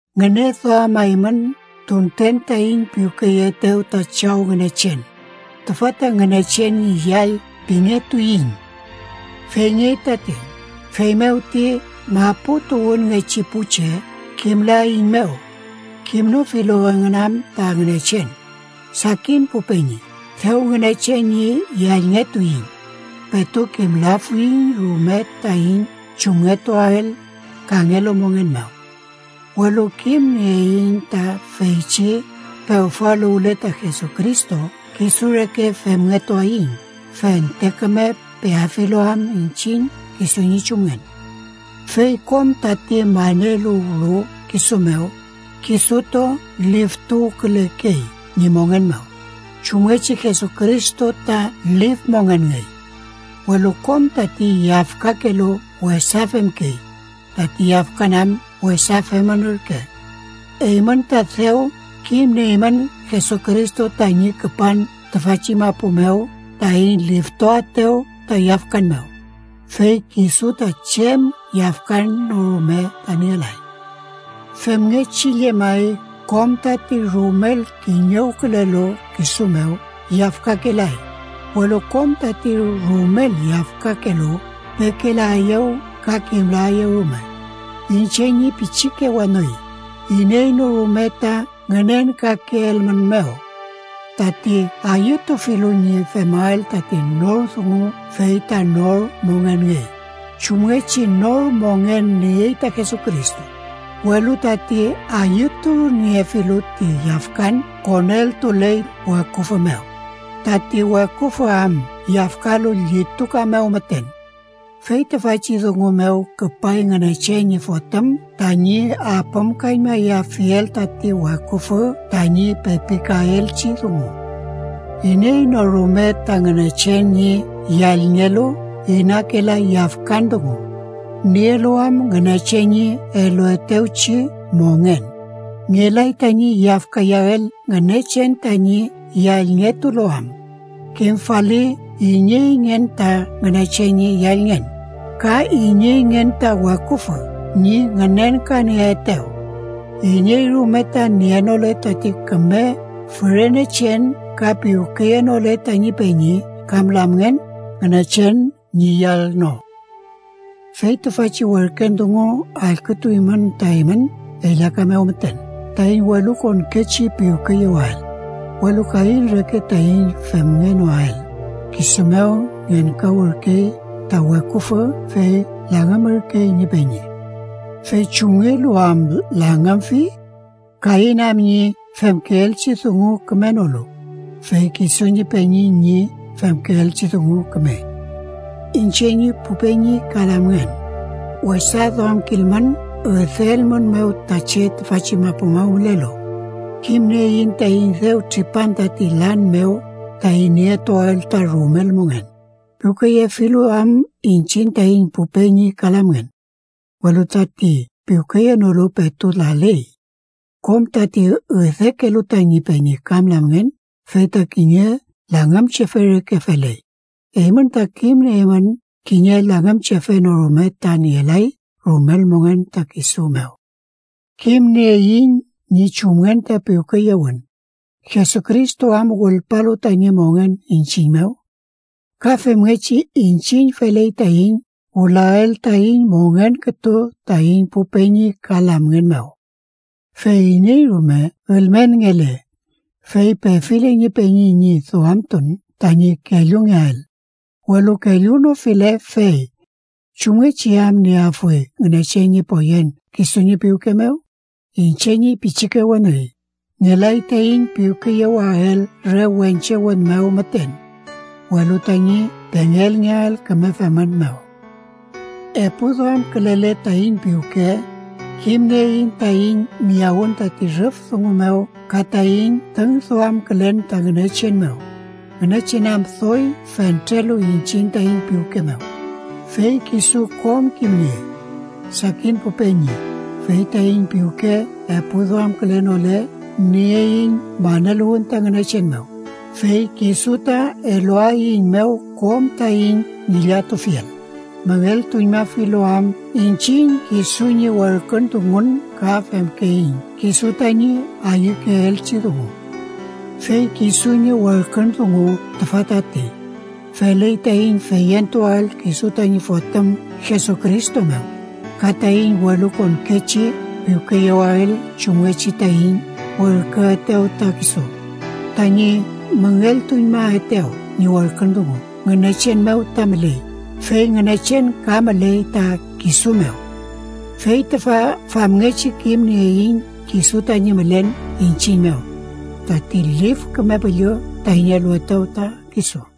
Ngüneduamaymün tunten taiñ piwkeyeetew ta Chaw Ngünechen, tüfa ta Ngünechen ñi yall pingetuiñ. ¡Feyngey tati! Feymew ti maputuwünngechi pu che kimlaeiñmew, kimnofilu engün am ta Ngünechen. Sakin pu peñi, dew Ngünechen ñi yallngetuiñ. Petu kimlafuiñ rume taiñ chumngetuael kangelu mongen mew, welu kimnieiñ ta feychi pewfaluwle ta Jesucristo kisu reke femngetuaiñ, fente küme peafilu am iñchiñ kisu ñi chumngen. Fey kom tati maneluwlu kisu mew, kisutu liftuwkülekey ñi mongen mew, chumngechi Jesucristo ta lif mongenngey. Welu kom tati yafkakelu wesa femkey, tati yafkan am wesa femün ürke. Eymün ta dew kimnieymün Jesucristo tañi küpan tüfachi mapu mew taiñ liftuaetew ta yafkan mew, fey kisu ta chem yafkan no rume ta nielay. Femngechi llemay, kom tati rumel kiñewkülelu kisu mew yafkakelay, welu kom tati rumel yafkakelu pekelaeyew ka kimlaeyew rume. Iñche ñi pichike weni, iney no rume ta ngünenkakeelmünmew. Tati ayütufilu ñi femael tati nor dungu fey ta nor mongenngey, chumngechi nor mongen niey ta Jesucristo, welu tati ayütuniefilu ti yafkan koneltuley ta weküfü mew, tati weküfü am yafkalu llituka mew müten. Fey tüfachi dungu mew küpay Ngünechen ñi Fotüm tañi apümkañmayafiel tati weküfü tañi pepikaelchi dungu. Iney no rume ta Ngünechen ñi yallngelu inakelay yafkan dungu, nielu am Ngünechen ñi eluetewchi mongen. Ngelay tañi yafkayael Ngünechen tañi yallngetulu am. Kimfali ineyngen ta Ngünechen ñi yallngen, ka ineyngen ta weküfü ñi ngünenkanieetew: iney rume ta nienole tati küme fürenechen ka piwkeyenole tañi peñi kam lamngen, Ngünechen ñi yall no. Fey tüfachi werken dungu allkütuymün ta eymün ellaka mew müten: taiñ welukonkechi piwkeyewael. Welu Kain reke taiñ femngenoael, kisu mew ngenkawürkey ta weküfü fey langümürkey ñi peñi. ¿Fey chumngelu am langümfi? Kain am ñi femkeelchi dungu kümenolu, fey kisu ñi peñi ñi femkeelchi dungu kümey. Iñche ñi pu peñi ka lamngen, wesa duamkilmün üdeelmünmew ta che tüfachi mapu mew mülelu. Kimnieiñ taiñ dew tripan tati lan mew taiñ nietuael ta rumel mongen, piwkeyefilu am iñchiñ taiñ pu peñi ka lamngen. Welu tati piwkeyenolu, petu laley. Kom tati üdekelu tañi peñi kam lamngen fey ta kiñe langümchefe reke feley. Eymün ta kimnieymün kiñe langümchefe no rume ta nielay rumel mongen ta kisu mew. Kimnieiñ ñi chumngen ta piwkeyewün, Jesucristo am wülpalu tañi mongen iñchiñ mew. Ka femngechi, iñchiñ feley taiñ wülael taiñ mongen kütu taiñ pu peñi ka lamngen mew. Fey iney rume ülmenngele, fey pefile ñi peñi ñi duamtun tañi kellungeael, welu kellunofile, fey ¿chumngechi am nieafuy Ngünechen ñi poyen kisu ñi piwke mew? Iñche ñi pichike weni, ngelay taiñ piwkeyewael re wenche wün mew müten, welu tañi pengelngeael küme femün mew. Epuduamkülele taiñ piwke, kimnieiñ taiñ miyawün tati rüf dungu mew ka taiñ tüngduamkülen ta Ngünechen mew, Ngünechen am doy fentrelu iñchiñ taiñ piwke mew, fey kisu kom kimniey. Sakin pu peñi, fey taiñ piwke epuduamkülenole, nieiñ maneluwün ta Ngünechen mew, fey kisu ta eluaeiñmew kom taiñ ngillatufiel, müngeltuñmafilu am iñchiñ kisu ñi werkün dungun ka femkeiñ kisu tañi ayükeelchi dungu. Fey kisu ñi werkün dungu tüfa tati: feley taiñ feyentuael kisu tañi Fotüm Jesucristo mew, ka taiñ welukonkechi piwkeyewael chumngechi taiñ werküetew ta kisu. Tañi müngeltuñmaetew ñi werkün dungu Ngünechen mew ta müley, fey Ngünechen ka müley ta kisu mew. Fey tüfa famngechi kimnieiñ kisu tañi mülen iñchiñ mew: tati Lif Küme Püllü taiñ eluetew ta kisu.